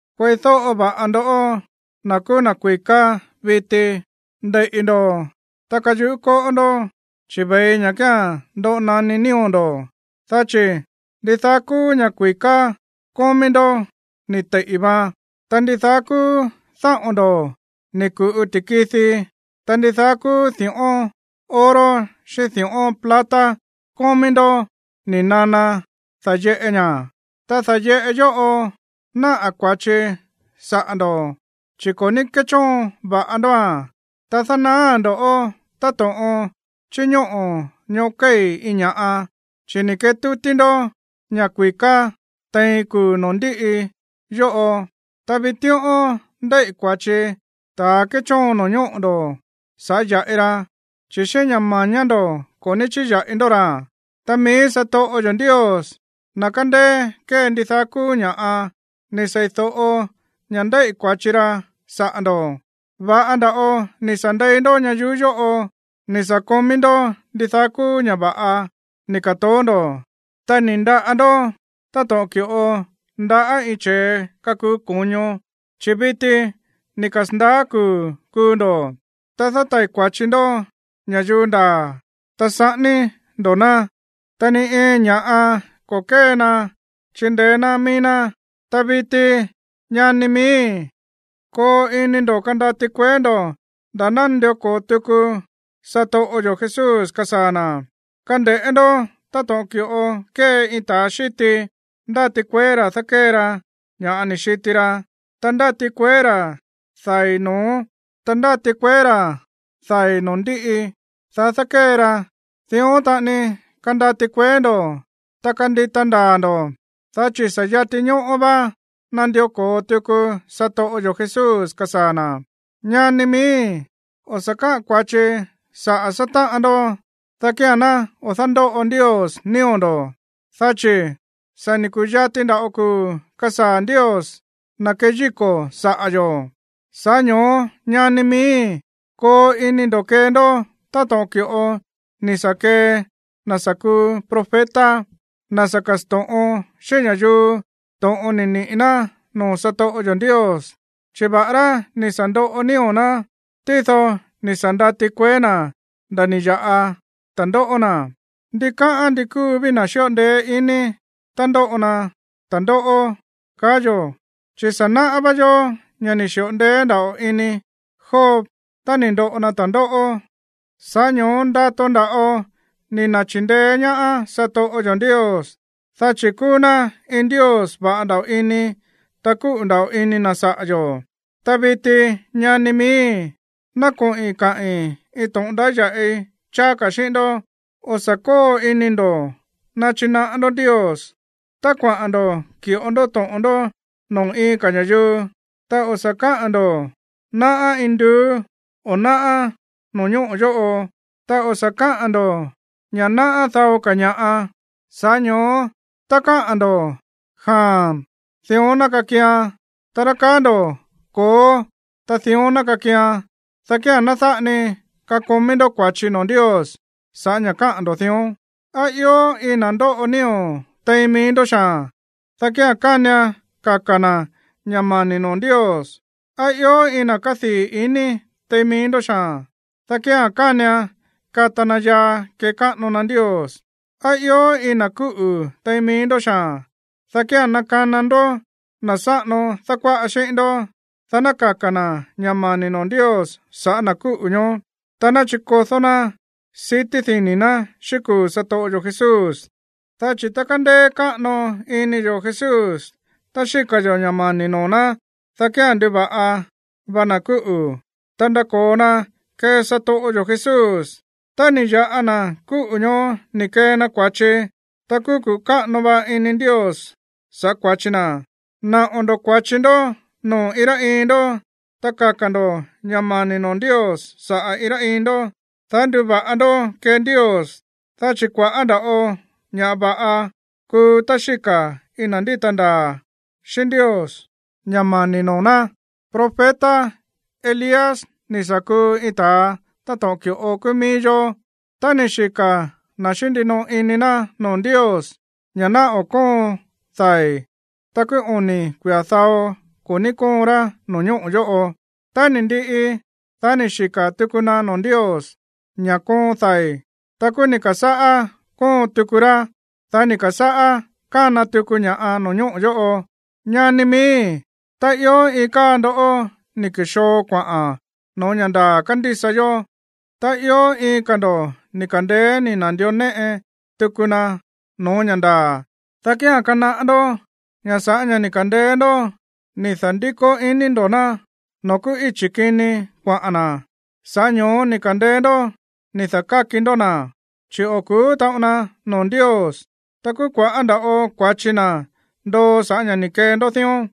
Kueídóꞌo va̱ꞌa ndoꞌó, na̱ kúú na̱ kui̱ká viti. Ndeiꞌi̱ ndo̱, ta kayuꞌú kóꞌó ndó, chi̱ ve̱i ña̱ kía̱n ndoꞌo naní nío̱ ndo̱. Dá chi̱ ndidaá kúú ña̱ kui̱ká kómí ndó ni̱ teiꞌi̱ vaan. Ta ndidaá kúú dáꞌo̱n ndo̱ ni̱ ku̱ꞌu ti̱kidi. Ta ndidaá kúú di̱ꞌón oro xíꞌín di̱ꞌón plata kómí ndó ni̱ nana da̱yeꞌe ña̱, ta da̱yeꞌe yóꞌo náꞌa̱ kua̱chi saꞌa̱ ndo̱, chi̱ ko̱ ní kéchóon va̱ꞌa ndóa̱n. Ta dánaáa̱n ndo̱ꞌó táto̱ꞌon chíñóꞌo̱ ñoꞌó kéi̱ iin ña̱ꞌa, chi̱ ni̱ ketútí ndó ña̱ kui̱ká tein kuu̱ noo̱ ndíꞌi yóꞌo. Ta vitíꞌón ndéíꞌi̱ kua̱chi ta̱ kéchóon no̱ñóꞌo̱ ndo̱ sa̱ꞌá ya̱ꞌi ra, chi̱ xíꞌín ña̱ mañá ndo̱ ko̱ ní chíya̱ꞌi ndó ra̱. Ta mií satoꞌo yo̱ Ndios, na̱ kándéé kée ndidaá kúú ña̱ꞌa, ni̱ seídóꞌo ña̱ ndéíꞌi̱ kua̱chi ra saꞌa̱ ndo̱. Va̱ꞌa nda̱ꞌo ni̱ sa̱ ndei ndó ñayuú yóꞌo, ni̱ sa̱ komí ndó ndidaá kúú ña̱ va̱ꞌa ni̱ ka̱toó ndo̱, ta ni̱ ndaꞌa ndo̱ táto̱ꞌon ki̱ꞌo ndaꞌá iin che̱e kakuu ko̱ño, chi̱ viti ni̱ kasa̱ndaá kuu̱ kuu ndo̱. Ta dátai̱ kua̱chi ndó ña̱yuu ndaa̱, ta saꞌání ndo̱ ná, ta ni iin ña̱ꞌa ko̱ kée ná chíndeé ná mií ná. Ta viti, ñani miíi̱, koo ini ndo̱ kandati kueé ndo̱ nda̱ ná nandió ko̱o tuku satoꞌo yo̱ Jesús kasaa̱ na̱. Kande̱ꞌé ndó táto̱ꞌon ki̱ꞌo kée iin ta̱a xíti, ndáti kueé ra̱ dákée ra ña̱ ni̱ xiti ra, ta ndáti kueé ra̱ dai̱ no̱ó, ta ndáti kueé ra̱ dai̱ noo̱ ndíꞌi, dá dákée ra. Dión taꞌani kandati kueé ndo̱, ta kandita ndaa̱ ndo̱, dá chi̱ sa̱ yati ñóꞌó vá nandió ko̱o tuku satoꞌo yo̱ Jesús kasaa̱ na̱. Ñani miíi̱, o̱ sa̱ káꞌa̱n kua̱chi saꞌa̱ sátáꞌan ndó, dá kía̱n ná o̱ dándóꞌo Ndios nío̱ ndo̱. Dá chi̱ sa̱ ni̱ ku̱yati nda̱ꞌo kuu̱ kasaa̱ Ndios, na̱ keyíko̱ saꞌa̱ yo̱. Sa̱ꞌá ño̱ó, ñani miíi̱, koo ini ndo̱ kee ndó táto̱ꞌon ki̱ꞌo ni̱ sa̱ kee na̱ sa̱ kuu profeta, na̱ sa̱ ka̱sto̱ꞌon xíꞌín ña̱yuu to̱ꞌon ni̱ niꞌi̱ ná noo̱ satoꞌo yo̱ Ndios. Chi̱ va̱ꞌará ni̱ sa̱ ndoꞌo nío̱ ná, tído ni̱ sa̱ ndati kueé na̱ nda̱ ni̱ ya̱ꞌa ta̱ndóꞌó na̱. Ndikáꞌán ndi kúu ví na̱ xíꞌo ndeé ini tá ndóꞌo na ta̱ndóꞌó, kaá yo̱. Chi̱ sa̱ náꞌá vá yó ña̱ ni̱ xi̱ꞌo ndeé nda̱ꞌo ini Job tá ni̱ ndoꞌo na ta̱ndóꞌó. Sa̱ꞌá ño̱ó ndato nda̱ꞌo ni̱ na̱chindeé ñaá satoꞌo yo̱ Ndios, dá chi̱ kúú ná iin Ndios va̱ꞌa nda̱ꞌo ini, ta kúꞌu̱ nda̱ꞌo ini na̱ saꞌa̱ yo̱. Ta viti, ñani miíi̱, ná koꞌi̱n kaꞌi̱n iin to̱ꞌon ndáya̱ꞌi cháá ka̱ xíꞌín ndó. O̱ sa̱ kóo ini ndo̱ nachinaꞌá ndó Ndios tá kuaꞌa̱n ndo̱ ki̱ꞌo ndó to̱ꞌon ndó noo̱ iin ka̱ ña̱yuu, ta o̱ sa̱ ka̱á ndo̱: “Náꞌá induú”, o: “Náꞌá no̱ñóꞌo̱ yóꞌo”, ta o̱ sa̱ káꞌa̱n ndo̱ ña̱ náꞌá dao ka̱ ña̱ꞌa. Sa̱ꞌá ño̱ó tá káꞌa̱n ndo̱ “Jaa̱n”, ta dión ná kakian. Ta rá káꞌa̱n ndo̱ “Ko̱ó”, ta dión ná kakian, dá kía̱n ná dáꞌa ni kakomí ndó kua̱chi noo̱ Ndios sa̱ꞌá ña̱ káꞌa̱n ndo̱ dión. ¿Á ió iin na̱ ndóꞌo nío̱ tein mií ndó xaa̱n? Dá kía̱n kánian kaka̱ na̱ ña̱ mani̱ noo̱ Ndios. ¿Á ió iin na̱ kádii̱ ini tein mií ndó xaa̱n? Dá kía̱n kánian kata na yaa kekáꞌano na Ndios. ¿Á ió iin na̱ kúꞌu̱ tein mií ndó xaa̱n? Dá kía̱n nakana ndó na̱ sáꞌano dákuáꞌa xíꞌín ndó, dá ná kaka̱ na̱ ña̱ mani̱ noo̱ Ndios sa̱ꞌá na̱ kúꞌu̱ ñoó, ta ná chikodó ná sití dini̱ ná xíꞌín kuu̱ satoꞌo yo̱ Jesús. Dá chi̱ tá kándéé káꞌano ini yo̱ Jesús tá xíka̱ yo̱ ña̱ mani̱ noo̱ ná, dá kía̱n nduva̱ꞌa va na̱ kúꞌu̱, ta ndako̱o na kee satoꞌo yo̱ Jesús. Tá ni̱ ya̱ꞌa na̱ kúꞌu̱ ñoó ni̱ kee na kua̱chi, ta kúú kuꞌu̱ káꞌano va ini Ndios sa̱ꞌá kua̱chi na̱. Naꞌo̱ ndo̱ kua̱chi ndó noo̱ iin rá iin ndó, ta kaka̱ ndo̱ ña̱ mani̱ noo̱ Ndios saꞌa̱ iin rá iin ndó, dá nduva̱ꞌa ndó kee Ndios. Dá chi̱ kua̱ꞌá nda̱ꞌo ña̱ va̱ꞌa kúu tá xíka̱ iin na̱ ndíta ndaa̱ xíꞌín Ndios ña̱ mani̱ noo̱ ná. Profeta Elías ni̱ sa̱ kuu iin ta̱a táto̱ꞌon ki̱ꞌo kúú mií yó. Ta ni̱ xika̱ na̱ xíꞌín ndinoꞌo ini na̱ noo̱ Ndios ña̱ ná o̱ kóon dai̱. Ta kúú oni̱ kuia̱ dao ko̱ ní kóon rá no̱ñóꞌo̱ yóꞌo. Tá ni̱ ndiꞌi, dá ni̱ xika̱ tuku na noo̱ Ndios ña̱ koon dai̱, ta kúú ni̱ ka̱sáꞌá kóon tuku rá. Dá ni̱ ka̱sáꞌá kána tuku ña̱ꞌa no̱ñóꞌo̱ yóꞌo. Ñani miíi̱, tá ió iin káa ndoꞌó ni̱ ku̱xoo kuaꞌa̱n no̱ó ña̱ ndaa̱ kándísa yó, ta ió iin ka̱ ndo̱ ni̱ ka̱ndeé ni̱ na̱ndió néꞌe tuku na no̱ó ña̱ ndaa̱, dá kía̱n kanaꞌá ndó ña̱ sa̱ꞌá ña̱ ni̱ ka̱ndeé ndó ni̱ da̱ndíko ini ndo̱ ná noo̱ kúú íchi̱ kini kuaꞌa̱n na̱, sa̱ꞌá ño̱ó ni̱ ka̱ndeé ndó ni̱ da̱káki ndó na̱, chi̱ o̱ ku̱ú taꞌon na noo̱ Ndios. Ta kúú kua̱ꞌá nda̱ꞌo kua̱chi na̱ ndoo sa̱ꞌá ña̱ ni̱ kee ndó dión.